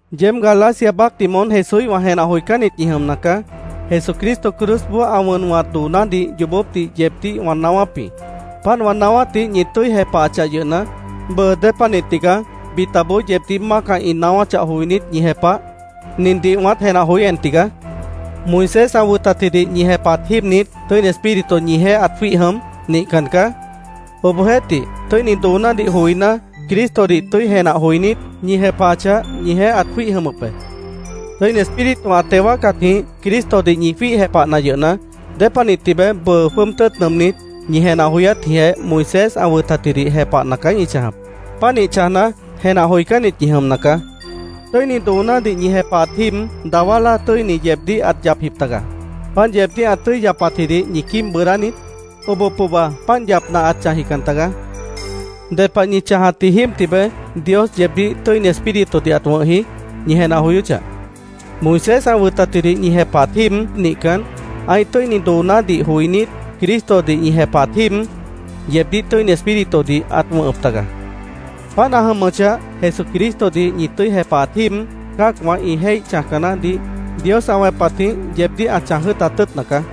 ¡Yeéb Galacia baácdih moón Jesúíhwã jenah joicánnit ñi jʉmna caá! Jesucristo cruzboó ã wʉn wʉ̃hat doonádih yoobópdih yeebdíh wã naáwáp jĩ. Páant wã naáwátdih ñi tʉ́i jepahachah yʉhna, bʉʉ ¿Dépanih tigaá bitaboó yeebdíh mácah ĩ naáwáchah joinít, ñi jepah? Nindih wãát jenah joí en tigaá: ¿Moisés ã wʉtatjidih ñi jepahat jíib niít Tʉ́ini Espíritu ñijeéh ãt jwíih jʉm? Nihcan caá. Obohjeéhtih, tʉ́ini doonádih joiná, Cristodih tʉ́i jenah joinít, ñi jepahachah, ñijeéh ãt jwíih jʉmʉp be. Tʉ́ini Espíritu ã teo wáacatjĩh Cristodih ñi jwíih jepahna yʉhna, ¿Dépanih tibeé bʉʉ jwʉ́ʉb tʉ́ʉt nʉʉmnít, ñi jenah joyátjĩhjeh Moisés ã wʉtatjidih jepahna caá ñi chãjap? Pánih chãjna, jenah joicánnit ñi jʉmna caá. Tʉ́ini doonádih ñi jepahatji jíib dawá láa tʉ́ini yeebdíh ãt yapjip tagaá. ¿Páant yeebdíh ã tʉ́i yapatjidih ñi quíib bʉʉdá niít? Oboh pohba páant yapna ãt chãjjican tagaá. ¿Ded pah ñi chãjatji jíib tibeé Dios yeebdíh Tʉ́ini Espíritudih ãt wʉ̃hji? ñi jenah joyóchah. Moisés ã wʉtatjidih ñi jepahat jíib nihcan, ã́ih tʉ́ini doonádih joinít, Cristodih ñi jepahat jíib, yeebdíh Tʉ́ini Espíritudih ãt wʉ̃hʉp taga. Páant ã jʉmʉchah, Jesucristodih ñi tʉ́i jepahat jíib cã́acwã ĩ jéih chãjca naáhdih Dios ã wẽpatjĩh yeebdíh ã chãj jʉ́ʉtat tʉ́ʉtna caá.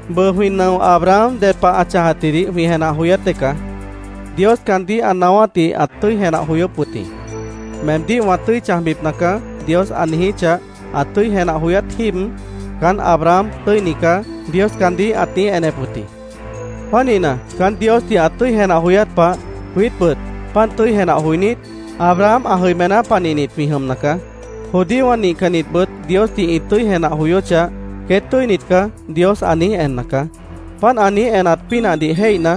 Bʉʉ, jwĩ nʉo Abraham ded pah ã chãjatjidih jwĩ jenah joyát dée caá. Dios caandíh ã naáwátdih ãt tʉ́i jenah joyóp wʉt jĩ. “Meemdíh wã tʉ́i chãjbipna caá”, Dios ã niijíchah, ã tʉ́i jenah joyát jíib, “Caán Abraham tʉ́ini caá”, Dios caandíh ãt niíj enep wʉt jĩ. Pánihna, caán Diosdih ã tʉ́i jenah joyát pah, jwiítbʉt páant tʉ́i jenah joinít, Abraham ã jʉimená panihnit jwĩ jʉmna caá. Judíowã nihcannitbʉt Diosdih ĩ tʉ́i jenah joyóchah, “Queét tʉ́init caá”, Dios ã niíj enna caá. Páant ã niíj enat pínahdih jéihna,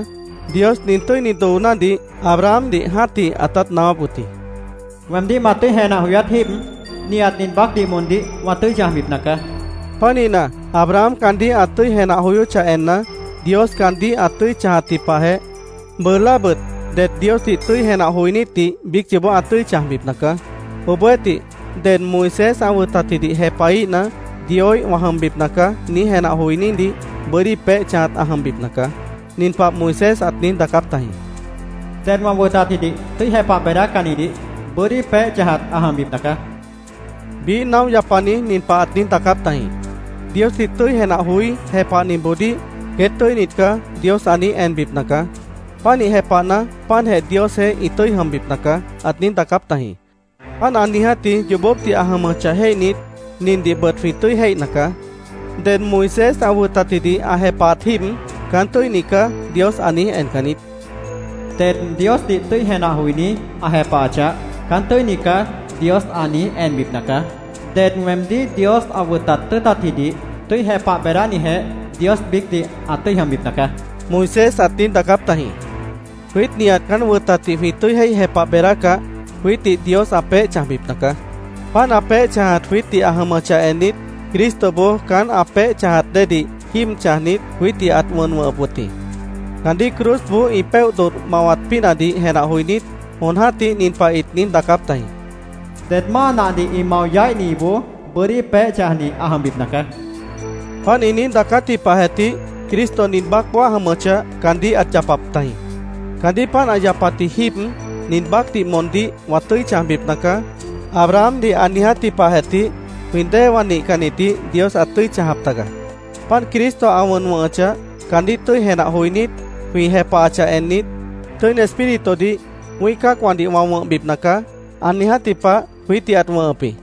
Dios nin tʉ́ini doonádih Abrahamdih jã́tih ãtát naáwáp wʉt jĩ: “Weemdíh ma tʉ́i jenah joyát jíib nihat nin baácdih moondíh wã tʉ́i chãjbipna caá”, ãt niijíp wʉt jĩ. Pánihna, Abraham caandíh ã tʉ́i jenah joyóchah enna, Dios caandíh ã tʉ́i chãjatji pahjeh, bʉʉ láabʉt det Diosdih tʉ́i jenah joinítdih biíc yoobó ã tʉ́i chãjbipna caá. Obohjeéhtih, ded “Moisés ã wʉtatjidih jepahíhna, Dioíh wã jʉmbipna caá”, niíj jenah joinídih bʉ́dí peéh chãjat ã jʉmbipna caá. Nin pah Moisés ãt niíj daacáp tajĩ: “Ded wã wʉtatjidih tʉ́i jepah beedácannidih bʉ́dí peéh chãjat ã jʉmbipna caá”, ãt niíj daacáp tajĩ. Biíh naóh yapani nin pah ãt niíj daacáp tajĩ: “Diosdih tʉ́i jenah joí, jepahnitboodíh ‘Queét tʉ́init caá’, Dios ã niíj enbipna caá. Pánih jepahna, páantjeh Diosjeéh ĩ tʉ́i jʉmbipna caá”, ãt niíj daacáp tajĩ. Páant ã niijátji yoobópdih ã jʉmʉchah jéihnit, nindihbʉt jwĩ tʉ́i jéihna caá: Ded Moisés ã wʉtatjidih ã jepahat jíib “Caán tʉ́ini caá”, Dios ã niíj encan niít. “Ded Diosdih tʉ́i jenah joiní, ã jepahachah, ‘Caán tʉ́ini caá’, Dios ã niíj enbipna caá. Ded weemdíh Dios ã wʉtat tʉ́ʉtatjidih tʉ́i jepah beedánijeh Dios biícdih ã tʉ́i jʉmbipna caá”, Moisés ãt niíj daacáp tajĩ. Jwiít nihat caán wʉtatdih jwĩ tʉ́i jéih jepah beedácah, jwiítdih Dios ã peéh chãjbipna caá. Páant ã peéh chãjat jwiítdih ã jʉmʉchah ennit, Cristoboó caán ã peéh chãjat déedih jíib chãjnit, jwiítdih ãt wʉn wʉ̃hʉp wʉt jĩ. Caandíh cruzboó ĩ péoh dodh mawat pínahdih jenah joinít, jon jã́tih nin pah ĩt niíj daacáp tajĩ: “Ded máa nahdih ĩ mao yaíhniboó bʉ́dí peéh chãjni ã jʉmbipna caá”, ĩt niíj daacáp tajĩ. Páant ĩ niíj daacátji pahjeh tih Cristo nin baácboó ã jʉmʉchah, caandíh ãt yapap tajĩ. Caandíh páant ã yapatji jíib, “Nin baácdih moondíh wã tʉ́i chãjbipna caá”, Abrahamdih ã niijátji pahjeh tih jwĩ déewã nihcannitdih Dios ãt tʉ́i chãjap taga. Páant Cristo ã wʉn wʉ̃hʉchah, caandíh tʉ́i jenah joinít, jwĩ jepahachah ennit, “Tʉ́ini Espíritudih wĩ́ih cã́acwãdih wã wʉ̃hbipna caá”, ã niijátji pah jwiítdih ãt wʉ̃hʉp jĩ.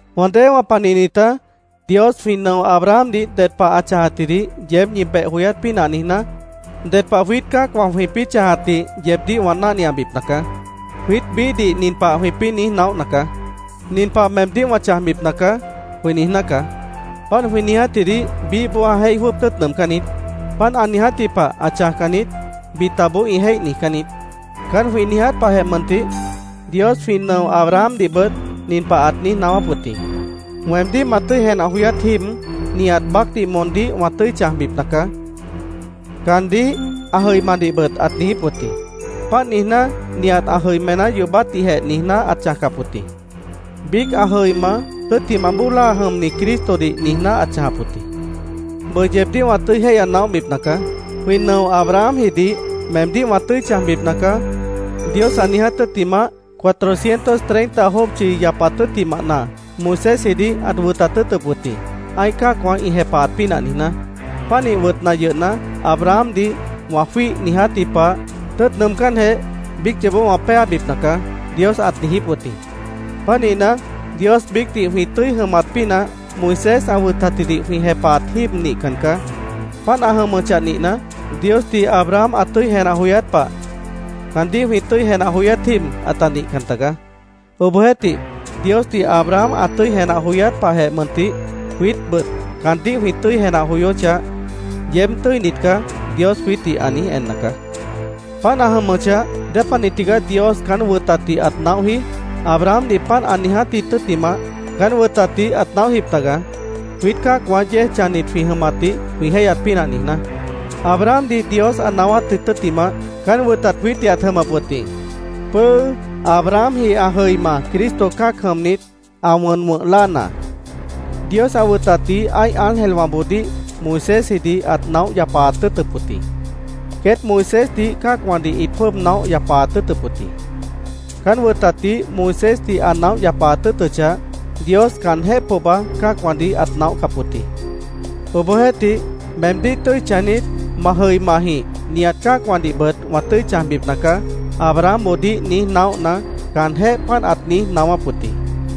Wã déewã panihnitá, Dios jwĩ nʉo Abrahamdih ded pah ã chãjatjidih yeéb ñi beh joyát pínah niijná, ded pah jwiít cã́acwã jwĩpĩ́ chãjatdih yeebdíh wã náhniabipna caá. Jwiít biíhdih nin pah jwĩpĩ́ niíj naóhna caá: “Nin pah meemdíh wã chãjbipna caá”, jwĩ niijná caá. Páant jwĩ niijátjidih biíhboó ã jéih jwʉ́ʉb tʉ́ʉt nʉʉmcán niít. “Páant ã niijátji pah ã chãjcan niít”, bitaboó ĩ jéih niijcán niít. Caán jwĩ niiját pahjeh mʉntih, Dios jwĩ nʉo Abrahamdihbʉt nin pah ãt niíj naáwáp wʉt jĩ: “Weemdíh ma tʉ́i jenah joyát jíib, nihat baácdih moondíh wã tʉ́i chãjbipna caá”, caandíh, ã jʉimadihbʉt ãt niijíp wʉt jĩ. Páant niijná, nihat ã jʉimená yoobátdihjeh niijná ãt chãjcap wʉt jĩ. Biíc ã jʉima, tʉ́ttimah bóo láa jʉmni Cristodih niijná ãt chãjap wʉt jĩ. Bʉʉ yeebdíh wã tʉ́i jéihya naóhbipna caá: Jwĩ nʉo Abrahamjidih “Meemdíh wã tʉ́i chãjbipna caá”, Dios ã niiját tʉ́ttimah, cuatrocientos treinta jópchi yapat tʉ́ttimahna Moisésjidih ãt wʉtat tʉ́ʉtʉp wʉt jĩ, ã́ih cã́acwã ĩ jepahat pínah niijná. Pánih wʉtna yʉhna, “Abrahamdih wã jwíih niijátji pah, tʉ́ʉt nʉʉmcánjeh, biíc yoobó wã péabipna caá”, Dios ãt niijíp wʉt jĩ. Pánihna, Dios biícdih jwĩ tʉ́i jʉmat pínah Moisés ã wʉtatjidih jwĩ jepahat jíib nihcan caá. Páant ã jʉmʉchah nihna, Diosdih Abraham ã tʉ́i jenah joyát pah, caandíh jwĩ tʉ́i jenah joyát jíib ãta nihcan tagaá. Obohjeéhtih, Diosdih Abraham ã tʉ́i jenah joyát pahjeh mʉntih, jwiítbʉt caandíh jwĩ tʉ́i jenah joyóchah, “Yeéb tʉ́init caá”, Dios jwiítdih ã niíj enna caá. Páant ã jʉmʉchah, ¿dépanih tigaá Dios caán wʉtatdih ãt naóhji? Abrahamdih páant ã niijátji tʉ́ttimah, caán wʉtatdih ãt naóhjip taga, jwiít cã́acwã yéej chãjnit jwĩ jʉmatdih jwĩ jéihyat pínah niijná. Abrahamdih Dios ã naáwátji tʉ́ttimah, caán wʉtat jwiítdih ãt jʉmʉp jĩ, pʉ́ʉ́ Abrahamji ã jʉima Cristo cã́ac jʉmnit, ã wʉn wʉ̃h láana. Dios ã wʉtatdih ã́ih ángelwãboodíh Moisésjidih ãt naóh yapaat tʉ́ʉtʉp wʉt jĩ. Queét Moisésdih cã́acwãdih ĩt jwʉ́ʉb naóh yapaat tʉ́ʉtʉp wʉt jĩ. Caán wʉtatdih Moisésdih ã naóh yapaat tʉ́ʉtʉchah, Dios caanjéh pohba cã́acwãdih ãt naóhcap wʉt jĩ. Obohjeéhtih, “Meemdíh tʉ́i chãjnit, ma jʉimajĩh nihat cã́acwãdihbʉt wã tʉ́i chãjbipna caá”, Abrahamboodíh niíj naóhna, caanjéh páant ãt niíj naáwáp wʉt jĩ.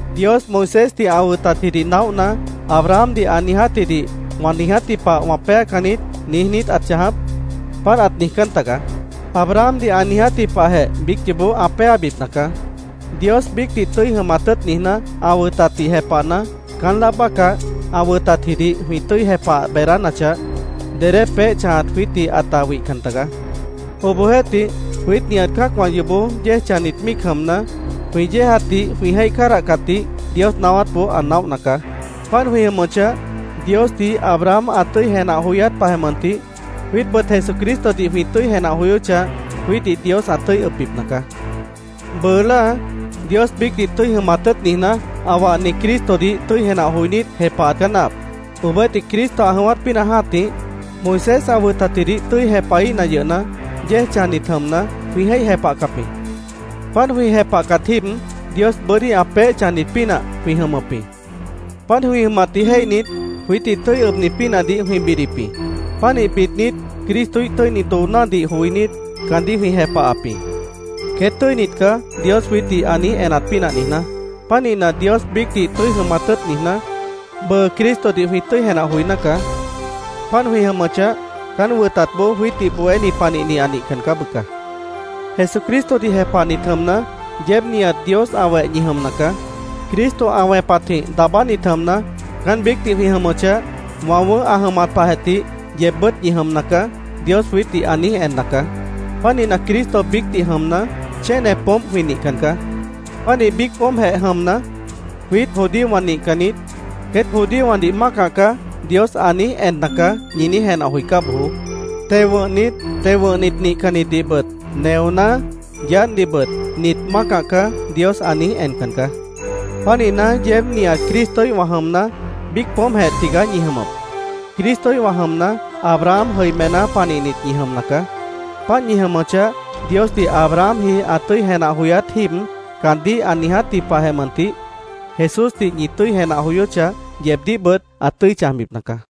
¿Dios Moisésdih ã wʉtatjidih naóhna, Abrahamdih ã niijátjidih “Wã niijátji pah wã péacan niít”, niíj niít ãt chãjap? Páant ãt niijjícan tagaá. Abrahamdih ã niijátji pahjeh biíc yoobó ã péabipna caá. Dios biícdih tʉ́i jʉmat tʉ́ʉt niijná, ã wʉtatdih jepahna, caán láa bácah, ã wʉtatjidih jwĩ tʉ́i jepah beedánachah, dedé peéh chãjat jwiítdih ãta wihcan tagaá. Obohjeéhtih, jwiít nihat cã́acwã yoobó yéej chãjnit míic jʉmna, jwĩ yéejatdih jwĩ jéih cádahcatdih Dios naáwátboó ã naóhna caá. Páant jwĩ jʉmʉchah, Diosdih Abraham ã tʉ́i jenah joyát pahjeh mʉntih, jwiítbʉt Jesucristodih jwĩ tʉ́i jenah joyóchah, jwiítdih Dios ã tʉ́i ʉbbipna caá. Bʉʉ láa, Dios biícdih tʉ́i jʉmat tʉ́ʉt niijná, ã wahni Cristodih tʉ́i jenah joinít, jepahat caá náahap. Obohjeéhtih, Cristo ã jʉ̃ʉ́wát pínah jã́tih, Moisés ã wʉtatjidih tʉ́i jepahíhna yʉhna, yéej chãjnit jʉmna, jwĩ jéih jepahcap jĩ. Páant jwĩ jepahcat jíib, Dios bʉ́dí ã peéh chãjnit pínah jwĩ jʉmʉp jĩ. Páant jwĩ jʉmatdih jéihnit, jwiítdih tʉ́i ʉbni pínahdih jwĩ bidip jĩ. Pánih bidnit, Cristoíh tʉ́ini doonádih joinít, caandíh jwĩ jepahap jĩ, “Queét tʉ́init caá”, Dios jwiítdih ã niíj enat pínah niijná. Pánihna, Dios biícdih tʉ́i jʉmat tʉ́ʉt niijná, bʉʉ Cristodih jwĩ tʉ́i jenah joiná caá. Páant jwĩ jʉmʉchah, caán wʉtatboó jwiítdih bohéni panihni ã nihcan caá, bʉca. Jesucristodih jepahnit jʉmna, yeéb nihat Dios ã weh ñi jʉmna caá. Cristo ã wẽpatjĩh daabánit jʉmna, caán biícdih jwĩ jʉmʉchah, “Wã wʉ̃ʉ́h ã jʉmat pahjeh tih yeebbʉ́t ñi jʉmna caá”, Dios jwiítdih ã niíj enna caá. Pánihna, Cristo biícdih jʉmna, chéne poómp jwĩ nihcan caá. Pánih biíc poómpjeh jʉmna, “ ‘Jwiít judíowã nihcannit, queét judíowãdih mácah caá’, Dios ã niíj enna caá”, ñi niíj jenah joicá bojoó. Teo wʉ̃hnit, teo wʉ̃hnit nihcannitdihbʉt; neoná, yaádhdihbʉt “Nit mácah caá”, Dios ã niíj encan caá. Pánihna, yeéb nihat Cristoíhwã jʉmna, biíc poómpjeh tigaá ñi jʉmʉp. Cristoíhwã jʉmna, Abraham jʉimená panihnit ñi jʉmna caá. Páant ñi jʉmʉchah, Diosdih Abrahamji ã tʉ́i jenah joyát jíib caandíh ã niijátji pahjeh mʉntih, Jesúsdih ñi tʉ́i jenah joyóchah, yeebdíhbʉt ã tʉ́i chãjbipna caá.